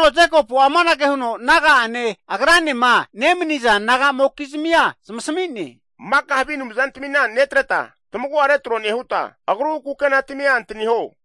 Jekopu'a amanage huno naga'ane, agrane nemnizamokizmi zamasmi'ne. Maka'a havi anumzana netreta, tamagu'a retro nehuta, kukena timia antaniho.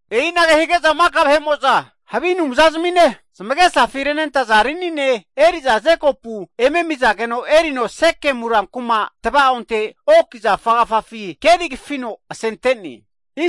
E'inage hige'za maka'a vahe'mo'za havi anumza zimine, zamegesafi renentaza rinine eri'za Jekopu eme amizageno erino Sekemu kuma tva'onte oak zafa agafafi keri kafino asente'ne.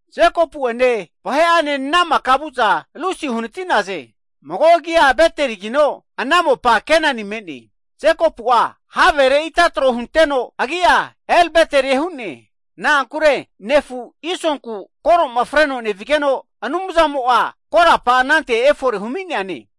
Jekopu'ene vahe'ane ana maka vu'naze. Nevu'za Lusi uhnati'naze, mago agi'a Beteli'e, ana mopa Kenani me'ne, Jekopu'a havere ita tro hunteno agi'a El Beteli hu'ne, na'ankure nefu Isonku koro'ma freno nevigeno Anumzamo korapara anante fore humi'neane,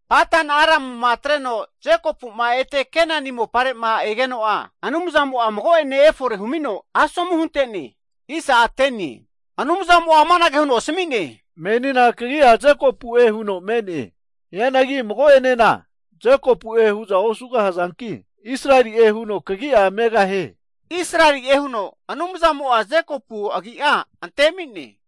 Padan-aramuti ete ne-egeno Anumzamo Jekopuna mago'ene fore humino, asomu hunte'ne. Anumzamo amanage huno asmi'ne, Kagi'a Jekopu'e, mago'ene Jekopu'e osugahaze, hagi menia kagi'a Israeli'e huno megahie. Israeli'e huno Agra ante'ne.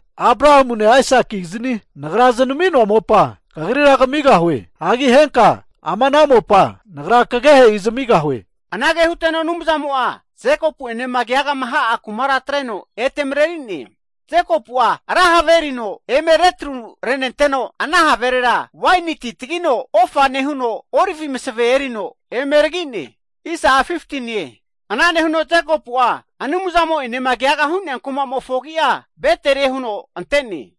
Mopa Abrahamune, Aisaki'gizni Nagra znami'noe, Nagra kagri kmigahue, Nagra henka ama mopa kagehe'i zamigahue. Huteno Anumzamo Jekopu ene keaga hu'nea kumateti atreno ete Agra mreri'ne. Jekopu'a ra have erino eme retru rente'ne, ana haverera waini ti tagino ofa nehuno, oliv masve erino eme neragino, Anumzane naneke hu kumare huno hu'ne. Jekopu'a Anumzane keaga hu'nea kuma'mofo agi'a Beteli'e huno ante'ne.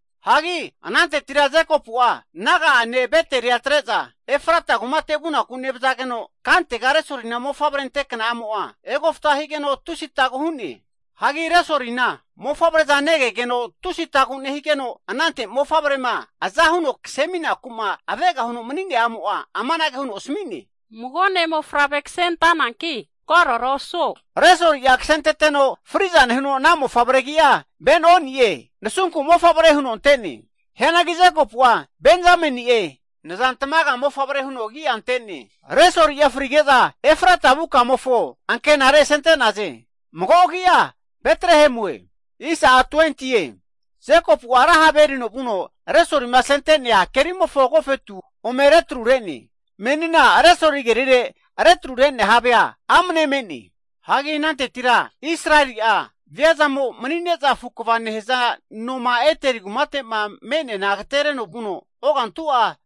Jekopu'a naga'ane Betel atre'za, Efrata kumate vuku nevzageno kantega Resolina mofavre ante kna'amo egofta higeno tusi atagu hu'ne. Mofavre'za negegeno tusi atagu nehigeno anante aza huno kse aminaku avega huno mani'nea a'mo amanage huno asmi'ne, ne'mofavre ksentananki kagogogu osuo. Resoli'a ksenteteno fri'za nehuno ana mofavre agi'a Ben-oni'e (nansunku mofavre) huno ante'ne, nehigeno Jekopu'a Benjameni'e (nza tamaga mofavre) huno ante'ne. Resoli'a frige'za Efrata vu kamofo ankenare asente'naze, (mago agi'a Betrehem.) Jekopu'a ra have erino vuno Resolima asente'nea kerimofo agofetu ome retru re'ne, menina Resoli kerire retru re'nea havea amne me'ne. Israeli'a (Jekopu'a) viazamo mani'ne'za afu kva nehza no (tawa) Ederi agatereteno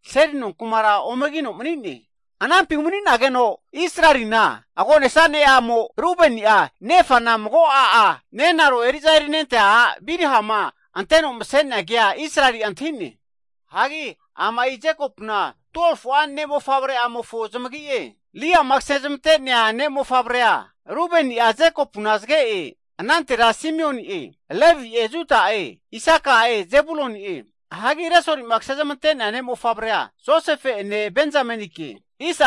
seli nonku'ma omegino mani'ne. Anampi umani'nageno Israelina (Jekopu'na) agonesa ne'amo Rubeni'a, nefana mago a'a, nenaro eri'za erinente'a a' Bilha anteno mse'nea, ke Israeli'a antahi'ne. Ama Jekopuna 12fu'a ne' mofavre zamagi'e. Lea ne'mofavre Rubeni'a Jekopuna zge'e, anante Simioni'e, Levi'e, Juda'e, Isaka'e, Zebuluni'e. Resoli ne'mofavre, Josefe ene Benjamenike.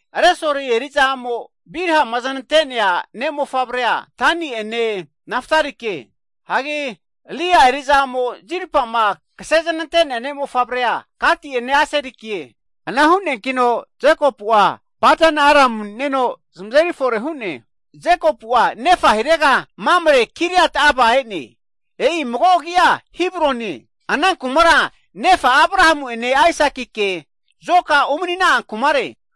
Resoli eri'za a'mo Bilha znante'nea ne'mofavre Dani'e magora Naftali'e. Lea eri'za a'mo Zilpa znante'neana Gati'e, Aseri'e Jekopu Padan-aram mani'neno zamante'ne. Jekopu'a nefa hirega Mamre Kiriat-arba e'ne, e'i Hebron mago agi'e, ana kumara nefa Abrahamu ene Aisakike zoka umnina'a kumare.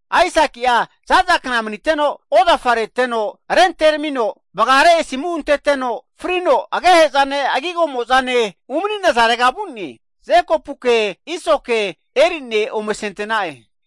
Aisaki'a zaza kna maniteno ozafa reteno rentermino, vgare asimu antete'no frino agehe'zane agigo mo'zane umani'nazarega vu'ne. Jekopuke, Isoke eri'ne ome asente'na'e.